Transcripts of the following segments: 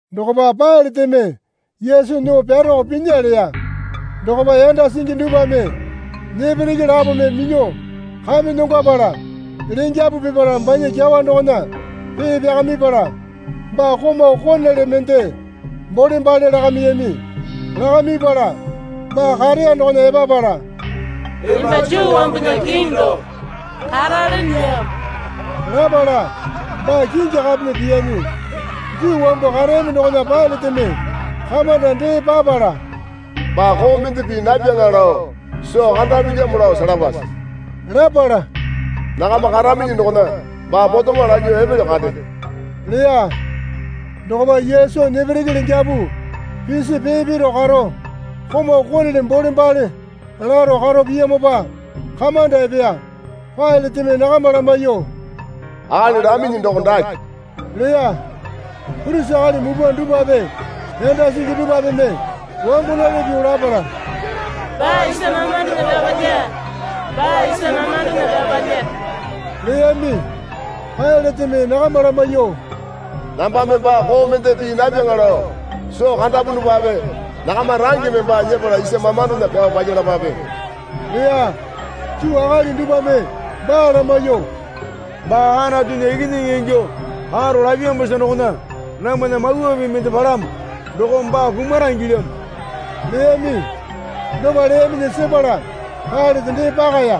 Dokopa Pailateme Yesu nyuo pyaroko pinya leya. Dokopa yanda singi dupwame nepereke lapome minyuo kamenyongwapala lengyapu pipala banya kyawa dokona pee pyakamipala baa komau konele mende bolembale lakamiyami. Lakamipala baa kareya dokona epapala, Emba Juu wambunya Kiŋi doko karalenelyamo, lapala baa kingi kapeme piyami. Juu wambu kareyami dokona Pailateme kamanda dee papala, Baa koo mende pii napyaŋa lao soo kandapilyamo lao selapase, lapala, Nakama karaminyi dokona baa potemo lanyuo epelyo kande, leya. Dokopa Yesu nepereke lengyapu pisi pee piro karo komau konele bolembale laro karo piyamopa kamanda epeya. Pailateme nakama lamaiyuo, Akali laminyi doko dake, leya. Purisi akali mupwa dupwape yanda singi dupwapeme wangonali pyuo lapala, Baa isa mamandona pyao palya, baa isa mamandona pyao palya, leyami. Pailateme nakama lamaiyuo, Nambame baa koo mende pii napyaŋa lao soo kandapunupape nakama rangeme baa nyepala isa mamandona pyao palyalapape, leya. Juu akali dupwame baa lamaiyuo, Baa Anatunya Ikinyingi ingyuo karo lapyamosa dokona namwana mawa pii mende palamo dokome baa kumara ingilyamo leyami. Dopa leyaminyi sepala Pailate dee pakaya.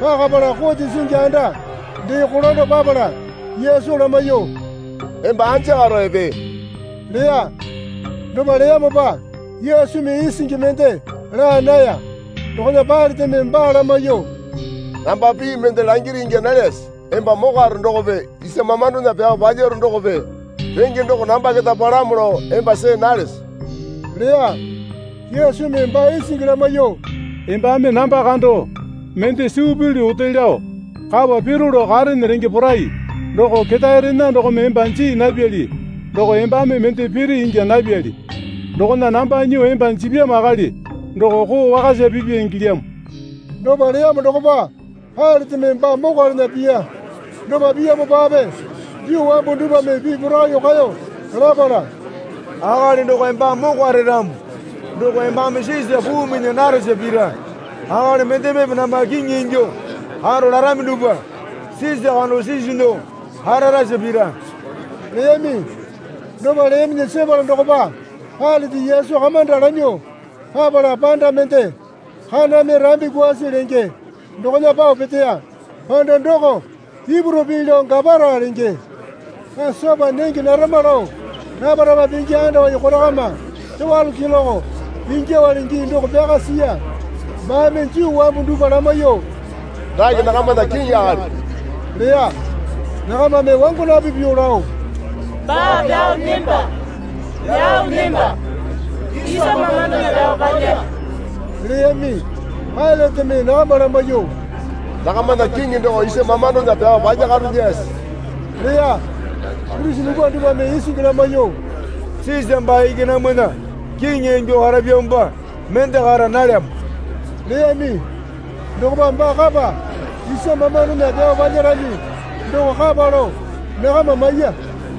Pakapala kote singi anda dee kolando papala Yesu lamaiyuo, Emba anja karo epee? leya. Dopa leyamopa Yesumi isingi mende laa naya. Dokona Pailateme baa lamaiyuo, Namba pii mende langiri ingya nalyase? Emba mokwaro dokope isa mamandona pyao palyaro dokope range doko namba keta palamo lao emba see nalese? leya. Yesumi baa isingi lamaiyuo, Embame namba kando mende suu pilyu ote lao kapa piro lao karene renge porai doko Ketaerena dokome emba jii napyali doko embame mende piri ingya napyali. Dokona namba nyuo emba jipyamo akali doko koo wakasa pipya ingilyamo. Dopa leyamo dokopa Pailateme baa mokwalana piya. Dopa piyamopape Juu wambu dupwame pii porakaiyuo kaeyo lapala, Akali doko embame mokware ramo doko embame Sisa puu minya naresa pira. Akali mendemepe namba kiŋi ingyuo karo larami dupwa Sisa kando sisu nyuo kararasa pira leyami. Dopa leyaminyi sepala dokopa Pailate Yesu kamanda lanyuo papala panda mende Kaname Rambi Kwaasi lenge dokona pao peteya. (Panda doko Ipuru pii lao Gapara lenge.) Pasopa nenge narama lao rapa rapa pingi andawai korokama towalo keloke ingyuowale gii doko pyaka siya. Baame Juu wambu dupwa lamaiyuo, Dake nakamana kiŋi akali, leya. Nakamame wangonapi pyuo lao, Baa pyao nemba, pyao nemba, isa mamandona pyao palya leyami. Pailateme nakama lamaiyuo, Nakamana kiŋi doko isa mamandona pyao palyakarolyase? leya. Purisi mupwa dupwame isingi lamaiyuo, Sisa baa iki namwana kiŋi ingyuo karapyamopa mende kara nalyamo leyami. Dokopa baa kapa isa mamandona pyao palyarami doko kapa lao nakama maiya.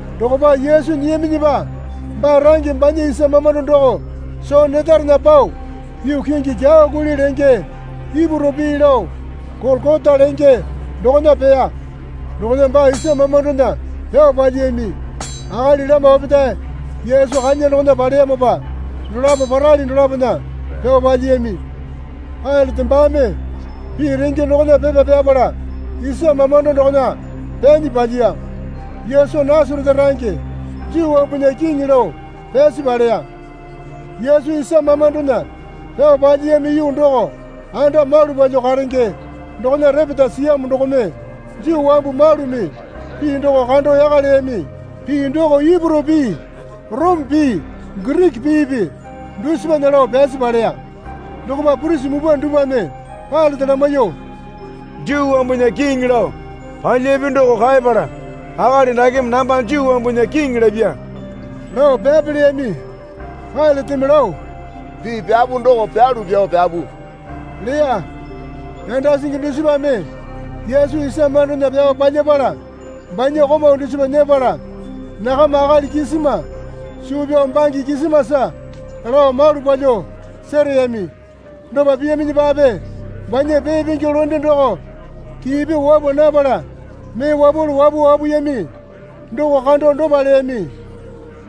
Dokopa Yesu nyiyaminyipa baa range banya isa mamando doko soo netarena pao yuu kingi Kyawa Kuli lenge (Ipuru pii lao Golokota lenge) dokona peya. Dokona baa isa mamandona pyao palyiyami. Akali lama opetae Yesu kanya dokona paleyamopa dolapo parali dolapona pyao palyiyami. Pailate baame pii renge dokona pepa pyapala isa mamando doko pyanyi palyiya. Yesu Nasarete range Juu wambunya Kiŋi lao pyasi paleya. Yesu isa mamandona pyao palyiyami yuu doko anda malu palyuo karenge dokona repeta siyamo dokome Juu wambu malumi pii doko kando yaka leyami. Pii doko Ipuru pii Orome pii Giriki piipi dusipana lao pyasi paleya. Dokopa purisi mupwa dupwame Pailate lamaiyuo, Juu wambunya Kiŋi, lao palyapi doko kaepala, Akali dakeme namba Juu wambunya Kiŋi lapya, lao pyape leyami. Pailateme lao, Pii pyapu doko pyalu pyao pyapu, leya. Yanda singi dusipame Yesu isa mamandona pyao palyapala banya komau dusipa nyepala nakama akali kisima suu pyao bange kisimasa lao malu palyuo sereyami. Dopa piyaminyipape banya pee pingi londe doko kii pyuo wapwa napala mee wapwalu wapuo wapuyami doko kando dopa leyami.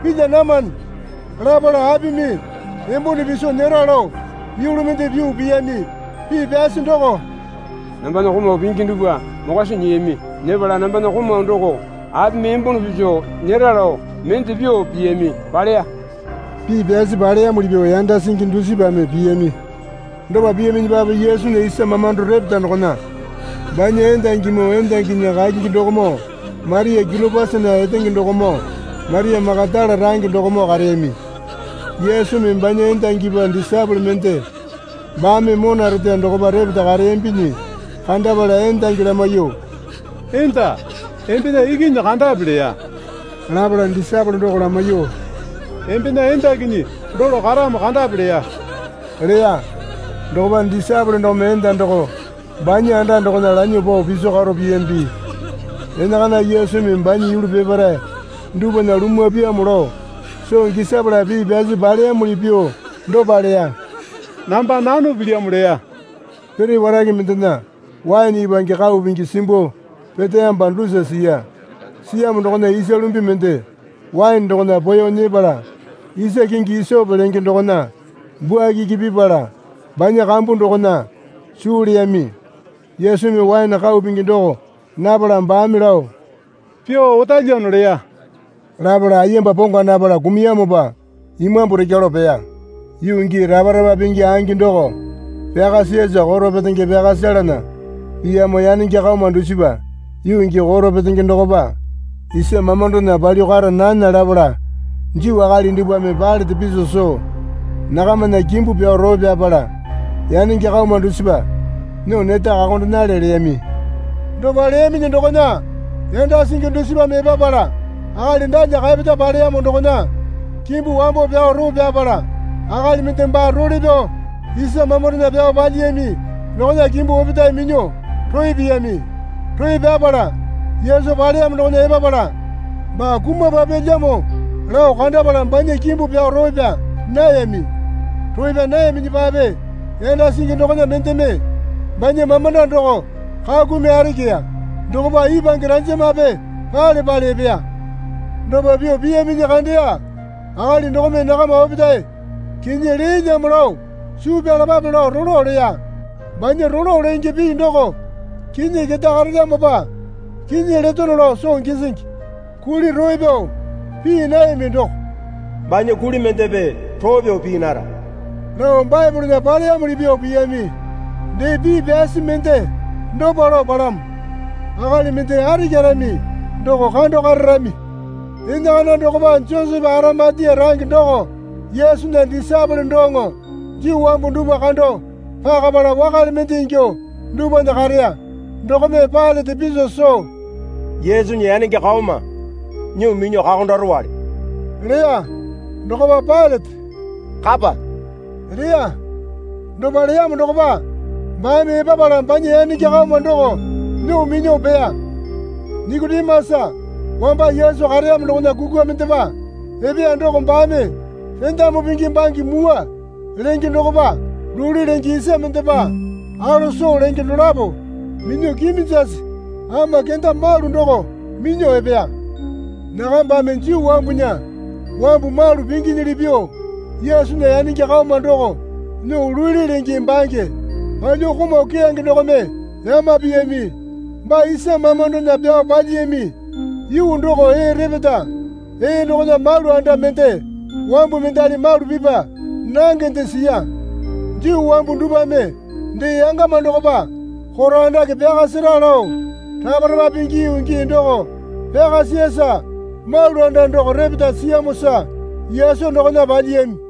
Pilya namane, lapala apimi embone piso nyera lao yulu mende pyuo piyami. Pii pyasi doko, Nambana komau pingi dupwa mokwa soo nyiyami. Nyepala nambana komau doko apimi embone piso nyera lao mende pyuo piyami, paleya. Pii pyasi paleyamuli pyuo yanda singi dusipame piyami. Dopa piyaminyipape Yesunya isa mamando repeta dokona banya endangimoo endanginya kakingi dokomoo Maria Kiliopasana etenge dokomoo Maria Makatala range dokomoo kareyami. Yesumi banya endangipa disaepole mende baame mona reteya dokopa repeta kareyambinyi kandapala endangi lamaiyuo, Enda, embena ikinyi kandape leya. Lapala disaepole doko lamaiyuo, Embena endakinyi dolo karamo kandape leya. Dokopa disaepole dokome enda doko banya anda dokona lanyuo pao piso karo piyambi. Enakana Yesumi banya yulu peparae dupwana lumwa pyaamo lao soo gisapala pii pyasi paleyamuli pyuo dopa leya. Namba nano pilyamo leya. Pere warake mendena waene ipwange kau pingi simbuo peteyamopa dusa siya. Siyamo dokona isa lumbi mende waene dokona poeyo nyepala isa kingi isope lenge dokona bwuakiki pipala banya kambu dokona suu leyami. Yesumi waene kau pingi doko napala baame lao, Pyuo otalyano leya. Lapala ayemba pongwa napala kumuyamopa imambu rekya lao peya. Yuu gii rapa rapa pingi angi doko pyaka siyasa koro petenge pyaka selana piyamo yanenge kaoma dusipa yuu gii koro petenge dokopa isa mamandona palyuo kara nami lapala Juu akali dupwame Pailate piso soo, Nakamana kimbu pyao roo pyapala yanenge kaoma dusipa nyuo neta kakondenale leyami. Dopa leyaminyi dokona yanda singi dusipame epapala akali dalya kaepeta paleyamo dokona kimbu wambo pyao roo pyapala akali mende baa role pyao isa mamandona pyao palyiyami dokona kimbu opetae minyuo roo piyami. Roo pyapala, Yesu paleyamo dokona epapala baa kumapapyalyamo lao kandapala banya kimbu pyao roo pyaa nayami. Roo pyaa nayaminyipape yanda singi dokona mendeme banya mamanda doko kakumi arikiya. Dokopa ipwange ranjamape pale pale epeya. Dopa pyuo piyaminyi kandeya akali dokome nakama opetae kinyi leelyamo lao suu pyalapape lao rolo leya. Banya rolo lenge pii doko kinyi keta karelyamopa kinyi letono lao soo gisingi. Kuli roo pyao pii nayami doko, Banya kuli mendepe roo pyao pii nara, lao Baepolena paleyamuli pyuo piyami. Dee, pii pyasi mende dopa lao palamo, Akali mende arikyarami doko kando kararami. Enakana dokopa Josepe Arimatia range doko Yesunya disaepole doŋo Juu wambu dupwa kando pakapala wakale mende ingyuo dupwana kareya dokome Pailate piso soo, Yesunya yanenge kaoma nyuo minyuo kakondarowale leya. Dokopa Pailate, Kapa leya. Dopa leyamo dokopa baame epapala banya yanenge kaoma doko nyuo minyuo peya. Nikotimasa wamba Yesu kareyamo dokona kukwa mendepa epeya doko baame rendamu pingi bange mwua lenge dokopa luli lenge isa mendepa alose lenge dolapo minyuo kiminjasi ama kenda malu doko minyuo epeya. Nakabame Juu wambunya wambu malu pinginyili pyuo Yesunya yanenge kaoma doko nyuo luli lenge bange palyuo komau keyange dokome yama piyami. Baa isa mamandona pyao palyiyami yuu doko ee repeta. Ee dokona malu anda mende wambu mendali malu pipa nangende siya. Juu wambu dupwame dee yangama dokopa koro andake pyaka sera lao rapa rapa pingi yuu gii doko pyaka siyasa malu anda doko repeta siyamosa Yesu dokona palyiyami.